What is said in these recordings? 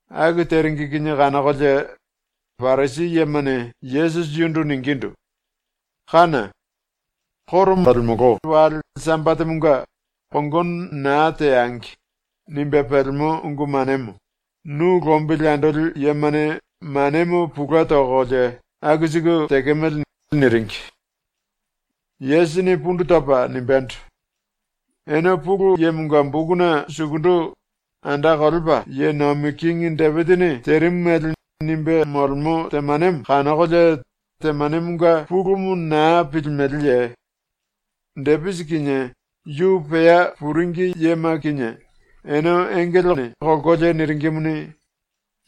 Aku teringi kinie kanokolie Parisi yemane Yesusi yundu ningindu: “Kána! ⸤Koro molemolo⸥ wale Sambatemonga ‘Kongono naa teangi.’ nimbe pelemo ungu manemo nu lombili andoli yemane manemo pulue tokolie aku siku tekemele.” niringi. Yesusini pundu topa nimbendo: “Ene Pulu Yemonga bokuna sukundu ⸤anda kolepa ye nomi kingi⸥ Depisini terimu mele nimbe molemo temanemo kanokolie temanemonga pulumu naa pilimeleye? Depisi kinie yu pea puringi yema kinie ene engelene kolkolie niringimuni,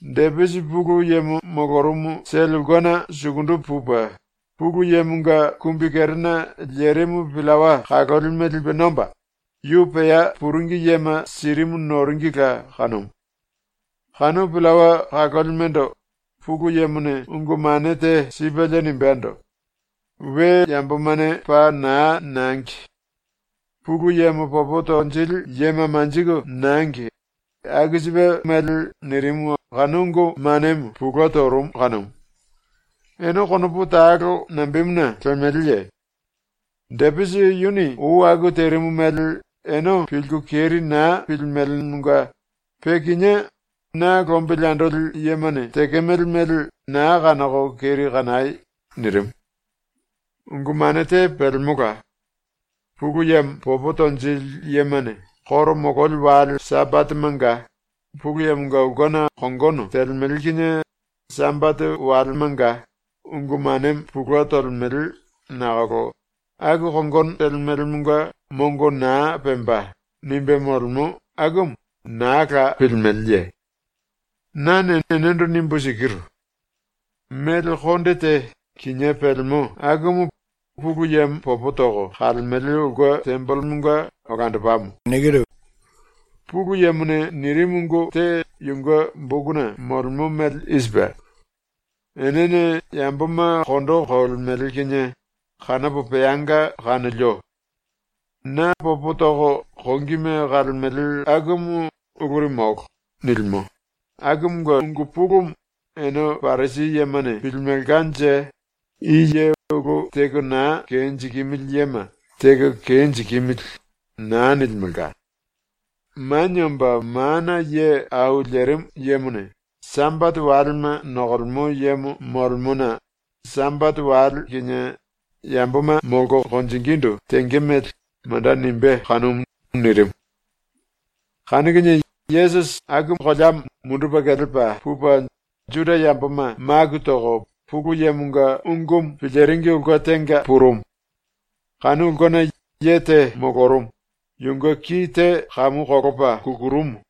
Depisi Pulu Yemo molorumu sele ulkena sukundu pupe, Pulu Yemonga kumbi kerena lerimu pillawa kalolime lipe nomba, yu pea puringi yema sirimu noringila kanumu. Kanu pillawa kalolimendo Pulu Yemone ungu mane te sipelie nimbendo: “We yambomane paa na nangi! Pulu Yemo popo tonjili yema manjiku nangi!” aku sipe mele nirimu ⸤kanu ungu manemo pulue torumu⸥ kanumu. ⸤Ene konopu talo nambemuna lemeleye? Depisi yuni ou aku terimu mele ene pilku keri naa pilimelemonga pe kinié na lombili andoli yemane tekemele mele na kanoko keri kanai.⸥” ⸤nirimu.⸥ “Ungu mane te pelemola. “Pulu Yemo popo tonjili yemane koro mololi wale Sambatemanga Pulu Yemonga ulkena kongono telemele kinie Sambate walemanga ungu manemo pulue tolemele nakolo aku kongono telemelemonga mongo naa pemba.” nimbe molemo akumu naa la pilimeleye? Nane enendo nimbu sikiru: Mele konde te kinié pelemo akumu Pulu Yemo popo toko kalemele ulke tembelemonga olandopamo. ⸤Pulu Yemone nirimu ungu te yunge bokuna molemo mele i sipe:⸥ “Enene yamboma kondo kolemele kinie kanopo peanga kanolio. Na popo toko kongime kalemele akumu uluri molo.” nilimo, akumunge ungu pulumu ene Parisi yemane pilimelkanje i ye ulu teko naa kenjikimili yema “Teko kenjikimili.” na nilimelka. Manie Omba Mana Ye Au Lerimu Yemone Sambate walema nokolemo yemo molemona ⸤Sambate wale kinie yamboma molko konjingindu tenge mele manda nimbé kanumu⸥.” nirimu. Kanu kinie Yesusi aku koleamo mundupe kelepa pupe Juda yamboma maku toko Pulu Yemonga ungumu piliringi ulke tenga purumu. Kanu ulkena ye te molorumu, yunge ki te kamu kolopa kukurumu.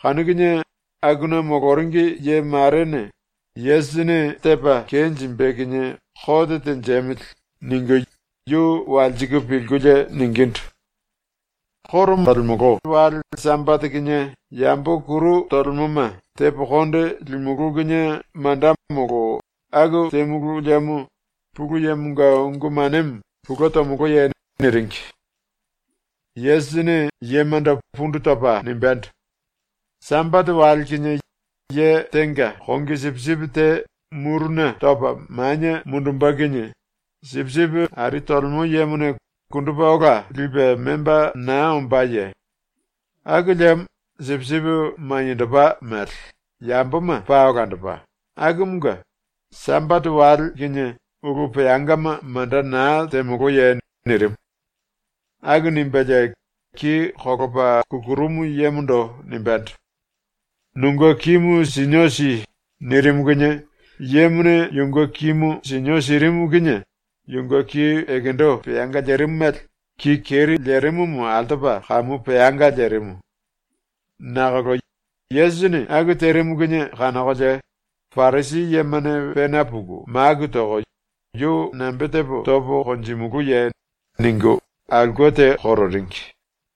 Kanu kinie akuna moloringi ye marene ‘Yesusini tepa kenjimbe kinie kote tenjemili.’ ningu yu walsiku pilkulie ningindu: “Koro molemolo wale Sambate kinie yambo kuru tolemoma tepo konde limulú kinie manda molo aku temulu liemo Pulu Yemonga ungu manemo pulue tomoloye?” niringi. Yesusini yemando pundu topa nimbendo: “Sambate wale kinie ye tenga kongi sipisipi te muruna topa manie mundumbe kinie sipisipi ari telemo yemone kundupe ola lipe memba naa ombáye? Aku liemo sipisipi maniendopa mele, yamboma paa olandopa, akumunge Sambate wale kinie ulu peangama manda na temoloye?” nirimu. Aku nimbelie ki kolopa kukurumu yemondo nimbendo: “Nunge kimu sinio si.” nirimu kinie yemone yunge kimu sinio sirimu kinie yunge ki ekendo peanga lerimu mele ki keri lerimumu altopa kamu peanga lerimu. Nakolo ⸤Yesusini aku terimu kinie kanokolie⸥ Parisi yemane pena puku maku toko “Yu nambe tepo topo konjimulúye?” ningu aulke te kororingi.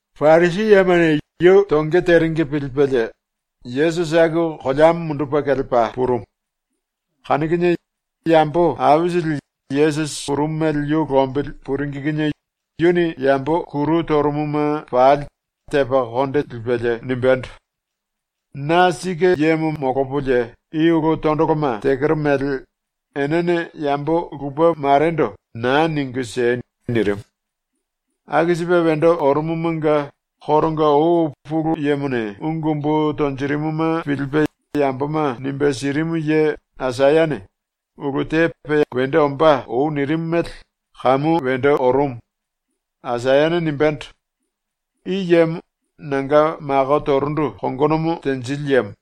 ⸤Parisi yemane⸥ yu tonge teringi pilipelie Yesusi aku koleamo mundupe kelepa purumu. Kanu kinie yambo aisili Yesusi purumu mele yu lombili puringi kinie yuni yambo kuru torumuma pali tepa konde lipelie nimbendo: “Na sike yemo molopolie i ulu tondoloma tekero mele enene yambo lupe marendo na ningu siei!” nirimu. Aku sipe wendo orumumunge koronga ou Pulu Yemone ungu umbu tonjirimuma pilipe yamboma nimbe sirimu ye Aisayane ulu te pe wendo ombá ou nirimu mele kamu wendo orumu. Aisayane nimbendo: “I yemo nanga mako torundu kongonomo tenjili yemo;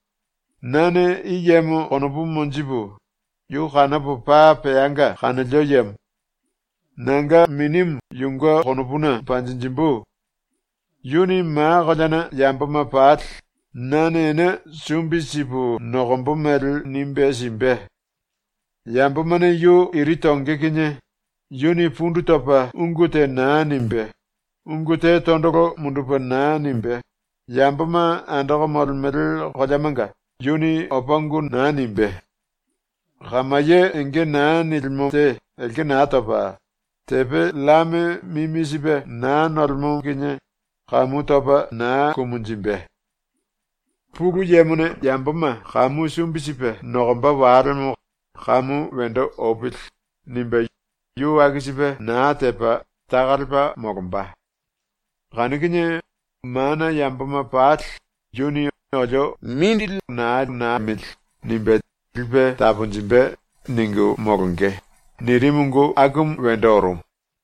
nane i yemo konopu monjipu, yu kanopo paa peanga kanolio yemo. Nanga Minimu yunge konopuna panjinjimbu. Yuni ma koleana yamboma pali nane ene sumbi sipu nokombo mele nimbe simbe. Yambomane yu iri tonge kinie yuni pundu topa ungu te naa nimbe, ungu te tondolo mundupe naa nimbe, yamboma andoko molemele koleamanga yuni opa ungu naa nimbé. Kamaye enge naa nilimo te elke naa topa, tepe llame mimi sipe naa nolemo kinie kamu topa naa kumunjimbe. ‘Pulu Yemone yamboma kamu sumbi sipe nokomba walemo kamu wendo opili.’ nimbe yu aku sipe naa tepa taka lepa molomba. Kanu kinie mana yamboma pali ‘Yuni ‘olio mongo naa liemili.’ nimbe lipe taponjimbe.’ ningu molonge.” nirimu ungu akumu wendo orumu.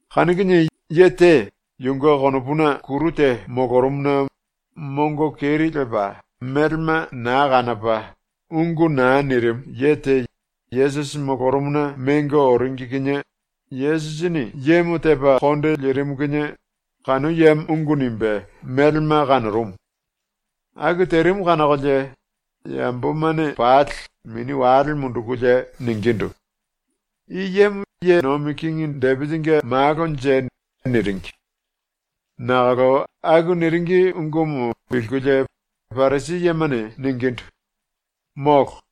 Kanu kinie ye te yunge konopuna kuru te molorumuna mongo keri lepa melema naa kanopa ungu naa nirimu ye te Yesusi molorumuna mengo oringi kinie Yesusini yemo tepa konde lirimu kinie kanu yemo ungu nimbe melema kanorumu. Aku terimu kanokolie yambomane pali mini wale mundukulie ningindu: “I yemo ye nomi kingi Depisinge malonje?” niringi. Nakolo aku niringi ungumu pilkulie Parisi yemane ningindu: “Molo.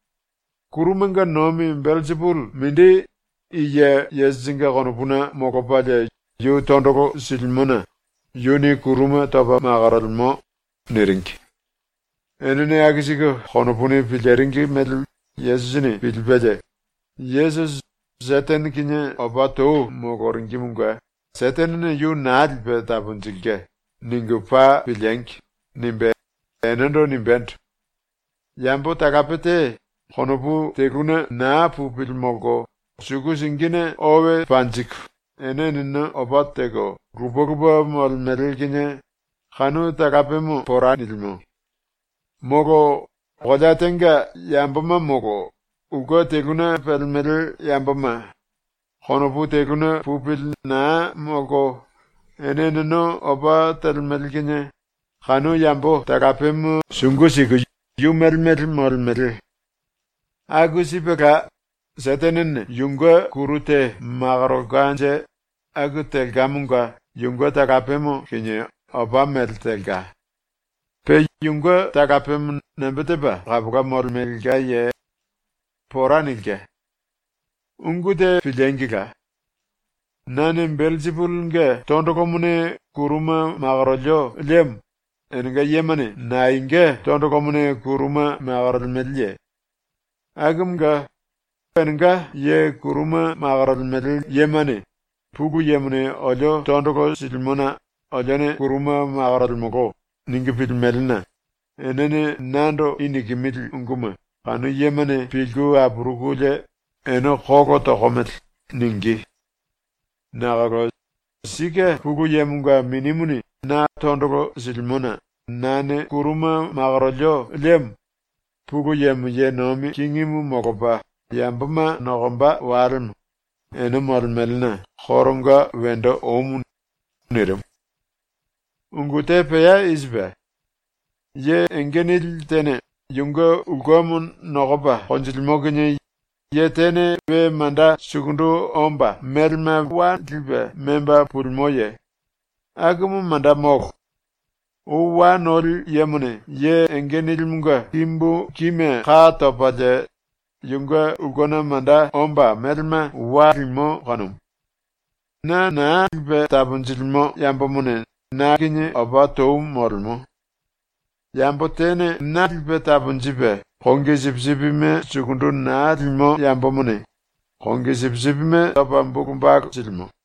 Kurumanga nomi Belsipuli mindi i ye Yesusinge konopuna molopalie yu tondolo silimona yuni kuruma topa makorolemo.” niringi. Enene aku siku konopuni piliringi mele Yesusini pilipelie ⸤‘Yesusi ‘Setene kinie opa tou moloringimunge Setenene yu naa lipe taponjilke.’ ningu paa piliengi!’ nimbe⸥ enendo nimbendo: “Yambo talape te konopu teluna naa pupili molko suku singine owe panjiku ene eneno opa teko lupe lupe molemele kinie kanu talapemo pora nilimo. ⸤Molo⸥ kolea tenga yamboma molo ulke teluna pelemele yamboma konopu teluna pupili naa molko ene eneno opa telemele kinie kanu yambo talapemo sungu siku yu mele mele molemele. Aku sipela, Setenene yunge kuru te makorolkanje aku telkamonga yunge talapemo kinie opa mele telka. Pe yunge talapemo nambe tepa kapola molemelkaye? ⸤Pora nilke.⸥ “Ungu te piliengila! Nane Belsipulinge tondolomone kuruma makorolio liemo enenga yemane naenga tondolomone kuruma makorolemeleye? Akumunge ⸤enenga ye kuruma makorolemele yemane ‘Pulu Yemone olio tondolo silimona olione kuruma makorolemolo.’ ningu pilimelena⸥ enene nando i nikimili unguma kanu yemane pilku apurukulie “Ene kolo tokomele.” ningí. Nakolo sike Pulu Yemonga Minimuni na tondolo silimona nane kuruma makorondu liemo Pulu Yemo ye nomi kingimu molopa yamboma nokomba walemo ene molemelena koronga wendo omu.” ⸤nirimu.⸥ “Ungu te pea i sipe: Ye enge nili tene yunge ulkemo nokopa konjilimo kinie ye tene we manda sukundu omba melema wa lipe memba pulimoye? Akumu manda molo. Ou wa noli yemone ye enge nilimunge kimbu kime ka topalie yunge ulkena manda omba melema wa limo kanumu. “Na naa lipe taponjilimo yambomone na kinie opa tou molemo. Yambo tene na lipe taponjipe ⸤kongi sipisipime⸥ sukundu naa limo yambomone ⸤kongi sipisipime⸥ topa bulu balu silimo.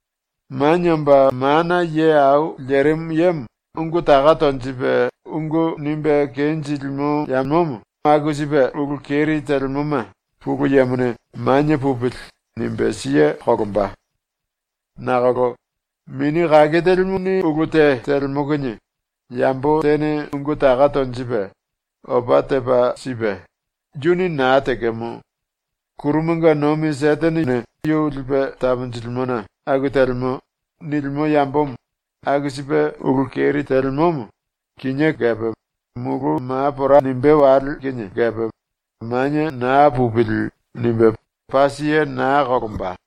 Manie Omba Mana Ye Au Lerimu Yemo ungu taka tonjipe ungu nimbe kenjilimo yambomo aku sipe ulu keri telemoma Pulu Yemone ‘Manie pupili.’ nimbe siye kolomba. Nakolo Mini Kake Telimu⸤ni ulu te telemo kinie⸥ yambo tene ungu taka tonjipe, opa tepa sipe ⸤“Yuni naa tekemo. Kurumanga nomi Setenene yu lipe taponjilimona aku telemo.⸥” nilimo yambomo aku sipe ulu keri telemomo kinié kepe mulu ma pora nimbé wale kinie kepe ‘Manie naa pupili.’ nimbe paa siye naa kolomba.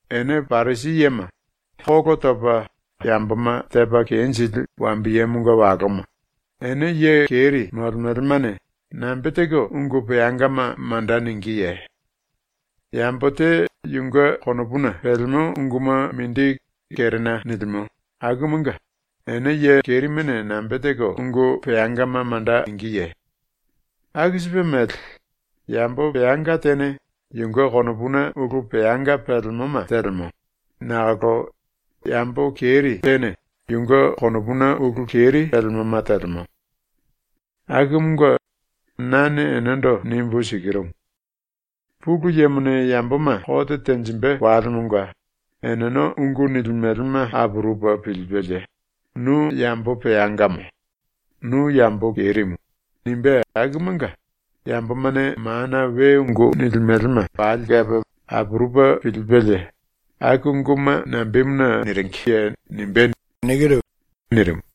Ene Parisi yema, kolo topa yamboma tepa kenjili wambiyemonga waloma, ene ye keri molemelemane nambe teko ungu peangama manda ningíye? Yambo te yunge konopuna pelemo unguma mindi kerena nilimo akumunge ene ye kerimene nambe teko ungu peangama manda ningíye? Aku sipe mele, yambo peanga tene yunge konopuna ulu peanga pelemoma telemo, nakolo yambo keri tene yunge konopuna ulu keri pelemoma telemo. Akumunge nane enendo nimbu sikirumu: Pulu Yemone yamboma kote tenjimbe walemonga eneno ungu nilimelema apurupe pilipelie “Nu yambo peangamo, nu yambo kerimu.” nimbé akumunge yambomane mana we ungu nilimelema pali kepe apurupe pilipelie “Aku unguma nambemuna niringiye?” nimbé.” nirimu.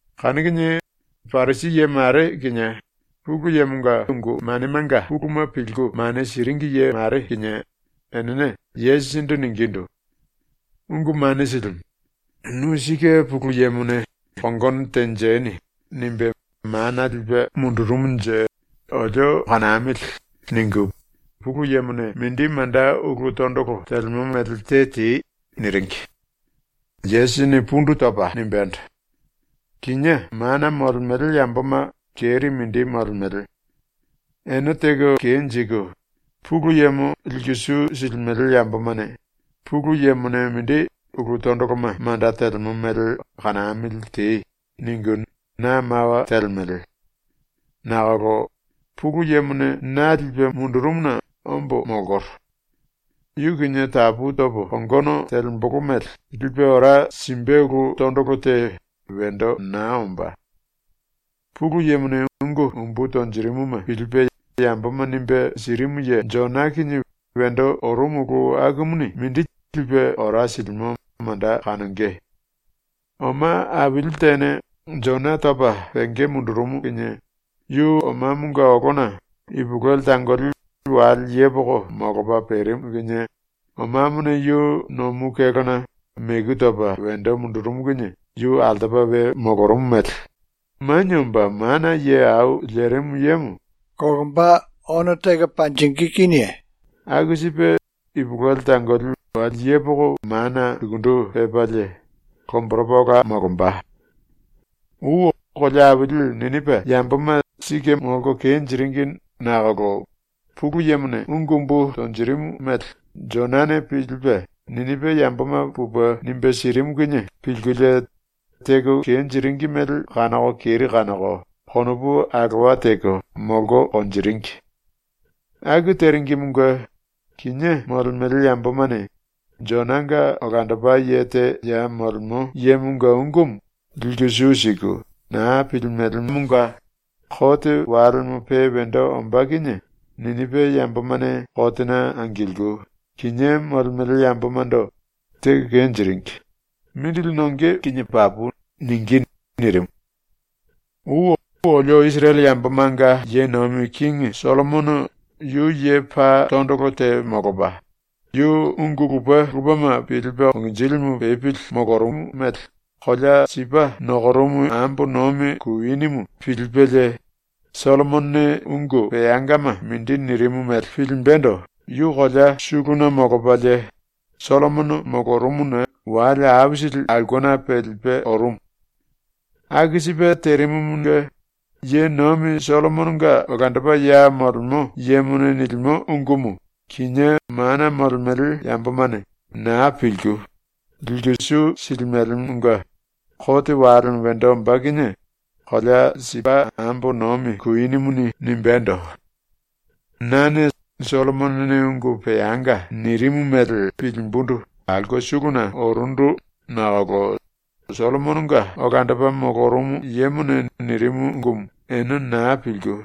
Kanu kinie Parisi ye mare kinie Pulu Yemonga ungu manemanga puluma pilku mane siringi ye mare kinie enene Yesusindu ningindu: “Ungu Mane Silimu, ‘Nu sike Pulu Yemone ‘Kongono tenjeni.’ nimbe mana lipe mundurumunje olio kanamili.’ ningu Pulu Yemone mindi manda ulu tondolo telemo mele te tei.” niringi. Yesusini pundu topa nimbendo: “Kinié mana molemele yamboma keri mindi molemele. Ene teko kenjiku Pulu Yemo liku su silimele yambomane “Pulu Yemone mindi ulu tondoloma manda telemo mele kanamili tei.” ningu na mawa telemele. Nakolo ⸤Pulu Yemone na lipe mundurumuna ombo molkoro. Yu kinie tapu topo kongono telembolo mele lipe ora simbe ulu⸥ tondolo te wendo naa ombá. Pulu Yemone ungu umbu tonjirimuma pilipe yamboma nimbe sirimu ye Jona kinie wendo orumu ulu akumuni mindi lipe ora silimo manda kanonge. Oma aili tene Jona topa penge mundurumu kinie yu omamonga olona ipulueli tangoli wale yepoko molopa perimu ⸤kinie omamone yu nomu kélona meku topa wendo mundurumu kinie yu altopa we molorumu⸥ mele Manie Omba Mana Ye Au Lerimu Yemo ⸤ono teko panjingí kinie⸥ aku sipe ipulueli tangoli wale yepoko mana sukundu pepalie ⸤lomboropa ola molomba⸥. “Ou kolea aili Ninipa yamboma ⸤sike molko kenjiringi nakolo Pulu Yemone ungu umbu tonjirimu mele⸥ Jonane ⸤pilipe⸥ Ninipa yamboma pupe nimbe sirimu kinie pilkulie teko kenjiringi mele kanoko keri kanoko konopu alowa teko molko konjiringi. Aku teringimunge kinié molemele yambomane Jonanga olandopa ye te ya molemo yemonga ungumu liku su siku naa pilimelemonga kote walemo pe wendo ombá kinie Ninipa yambomane kotena angilku, kinié molemele yambomando “Teko kenjiringi. Mindili nonge kinie papu.” ningí.” ⸤nirimu.⸥ “Ou olio Isirele yambomanga ye nomi kingi Sollomono yu ye paa tondolo te molopa, yu ungu lupe lupema pilipe konginjilimu pepili molorumu mele kolea Sipa nokorumu ambo nomi kuinimu pilipelie, Sollomonone ungu peangama mindi nirimu mele pilimbendo yu kolea suluna molopalie ⸤Sollomono molorumuna⸥ wale aisili aulkena pelipe orumu. Aku sipe terimumunge, ye nomi Sollomononga olandopa ya molemo yemone nilimo ungumu kinié mana molemele yambomane naa pilku, liku su silimelemonga kote walemo wendo ombá kinie kolea Sipa ambo nomi kuinimuni nimbendo: “Nane Sollomonone ungu peanga nirimu mele pilimbundu aulke suluna orundu nakolo Sollomononga olandopa molorumu yemone nirimu ungumu ene naa pilku,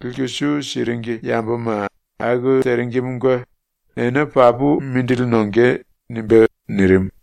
liku su siringi yamboma aku teringimunge ene papu mindili nonge.” nimbé.” ⸤nirimu.⸥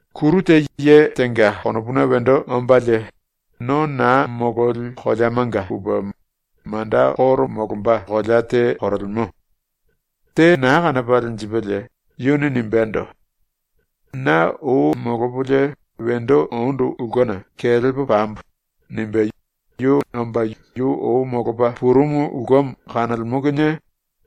“Kuru te ye tenga konopuna wendo ombalie, no naa mololi koleamanga pupe manda koro molomba kolea te korolemo. Te naa kanopa lenjipelie yuni nimbendo: “Na ou molopolie wendo ondu ulkena kelepo pambo.” nimbe yu omba yu ou molopa purumu ulkemo kanolemo kinie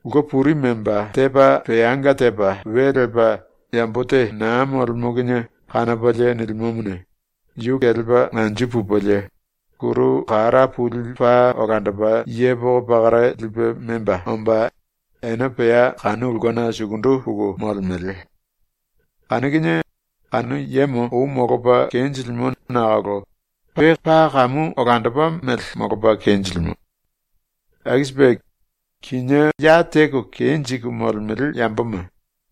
ulke puri memba tepa peanga tepa we lepa yambo te naa molemo kinie kanopalie nilimomone, yu kelepa anju pupelie kuru kara puli paa olandopa yepoko pakara lipe memba omba ene pea kanu ulkena sukundu puku molemele. Kanu kinie kanu yemo ou molopa kenjilimo nakolo pe paa kamu olandopa mele molopa kenjilimo. Aku sipe kinié ya teko kenjiku molemele yamboma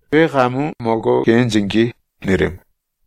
pe kamu molko kenjingí.” nirimu.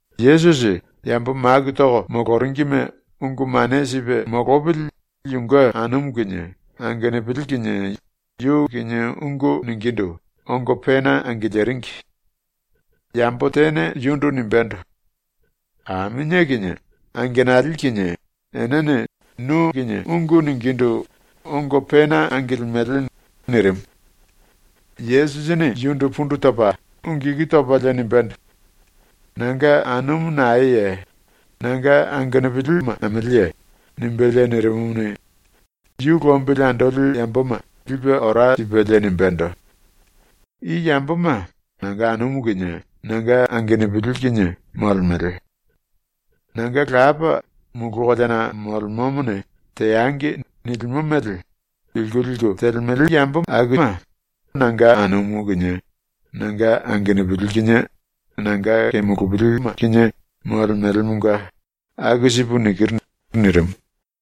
Yesusi yambo maku toko moloringime ungu mane sipe molopili yunge anumu kinie angenupili kinie yu kinie ungu ningindu ongo pena angiliringi. Yambo tene yundu nimbendo: “Aminie kinie angenali kinie enene nu kinie ungu ningindu ongo pena angilimele.” nirimu. Yesusini yundu pundu topa ⸤ungu iku topalie⸥ nimbendo: “Nanga anumu naeye? Nanga angenupili nameleye?” nimbelie nirimumuni, yu lombili andoli yamboma lipe ora sipelie nimbendo: “I yamboma nanga anumu kinie nanga angenupili kinie molemele. Nanga Lapa, mulu koleana molemomone “Teangi.” nilimo mele pilku liku telemele yamboma nanga anumu kinie nanga angenupili kinie nanga kemulupili kinie molemelemonga aku sipu nikiru.” nirimu.